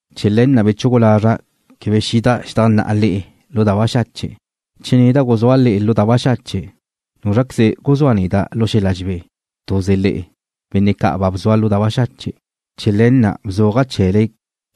Chee̱ le̱ na' bechugu lazra' quebe xida' xedajnná'a le'e lu da baxache'. Che neda' guzúa' le'e lu da baxache', ¿núzraqueze guzúa neda' lu xel-la dxebé? Tuze le'e, benne' ca' ba bzua' lu da baxache'. Chee̱ le̱ na' bzuaja' chee̱le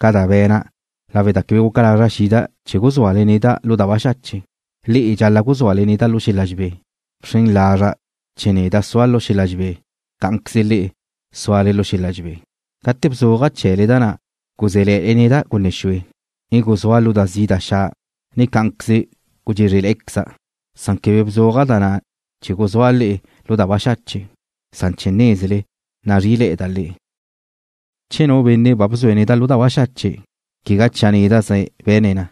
ca da be̱na' lawe' da quebe guca lazra' xida' chee̱ guzúale neda' lu da baxache', le'e na' dxal-la' guzúale neda' lu xel-la dxebé. Bxren lazra' che neda' zua' lu xel-la dxebé, cá'anqueze le'e súale lu xel-la dxebé. Gate bzuaja' chee̱le da na' guzé̱le̱'e̱da' gunne xue, ne guzúa' lu da zi' da xa', ne cá'anqueze gudxézrele̱'e̱queza', san quebe bzuaja' da na' chee̱ guzúa' le'e lu da baxache', san chee̱ nézele nazrí'ile̱'e̱da' le'e. Che nu benne' ba bzue̱' neda' lu da baxache', quegá chia' néda'ze be̱ne̱' na,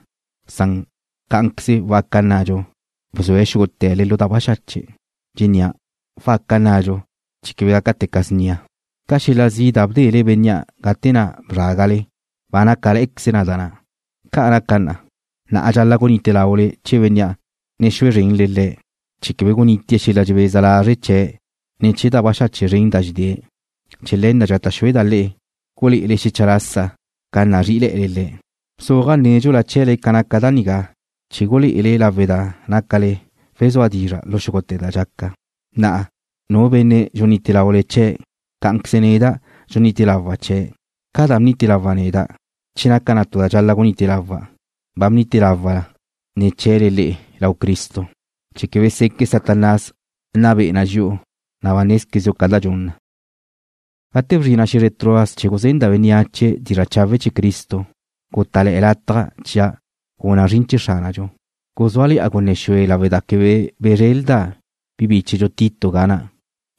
san cá'anqueze waca nnadxu, bzue̱' xúgute̱le lu da baxache'. Dxennía': Waca nnadxu, chee̱ quebe gácate̱ca' snia. Ca xel-la zi' da bdele bénnea' gate na' bzrágale, ba nácale̱'e̱queze da na'. Ca' naca na, na'a dxal-la' gunite laule chee̱ bénnea', ne xue zrenle le̱', chee̱ quebe gunitie̱' xel-la dxebeza lazre' chee̱' ne̱ chee̱ da baxache' zren da dxedée̱'. Chee̱ le̱ na' dxata' xueda' le'e gulé'ele le̱' xecha lasa ca nazrí'ile̱'e̱le le̱'. Bzuaja' nédxula chee̱le ca naca da nigá chee̱ gulé'e lawe' che nácale wezúe dizra' lu xúgute̱ da dxaca. Na'a, nu benne' dxunite laule chee̱', cá'anqueze neda' dxunite lawa' chee̱'. Ca da bnite lawa' neda', che naca na tu da dxal-la' gunite lawa', ba bnite lawa' na ne̱ chee̱le le'e lau Cristo chee̱ quebe seque' Satanás nna be'e na dxi'u, na' ba nézquezdxu ca da dxun na. Gate bzrina' xe̱zre Troas chee̱ guzenda' bénneache dizra' chawe' chee̱ Cristo, gutá'le̱'e̱ lataj chia' guna' zrin chee̱ Xránadxu. Guzúale̱'a gunne xue lawe' da quebe bezrelda' bi bíchedxu Tito ga na'.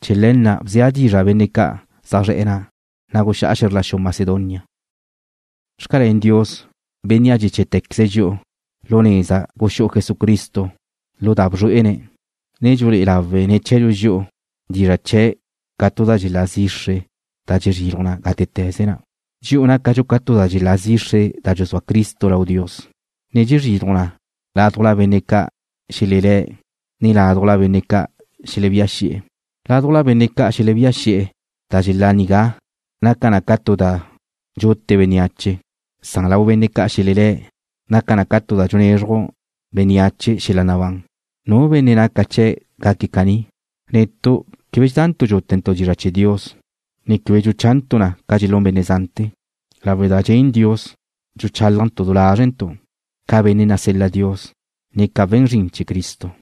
Chee̱ le̱ na' bzea' dizra' benne' ca' zaj zre̱'e̱ na', na' guxá'a xe̱zr la xu Macedonia. Xcalén Dios, Bénnea' dxeché̱'tequeze̱' dxi'u lu neza guxú'u Jesucristo lu da bzrué'ene̱', ne dxulé'e lawe̱' ne̱ chee̱dxu dxi'u dizra' chee̱' ca tu da dxelá zixre da dxezriluj gátete̱ze na. Dxi'u nácadxu ca da dxelá zixre da dxuzúa Cristo lau Dios, ne dxezriluj na ládujla benne' ca' xelelé̱', ne ládujla benne' ca' xelebía xi'e̱. Lau benne' ca' xelebía xi'e̱ da dxelá nigá naca na ca tu da dxute bénneache, san lau benne' ca' xelelé̱ naca na tu da dxunezruj na bénneache xel-la nabán. ¿Nu benne' naca chee̱' gaque̱' caní? Netu' quebe dxedantu' dxútentu' dizra' chee̱ Dios, ne quebe dxuchantu' na ca dxelún benne' zante̱. Lawe' da dxen Dios, dxuchálajntu' du lázrentu', ca benne' nasel-la Dios, ne ca we̱n zrin chee̱ Cristo.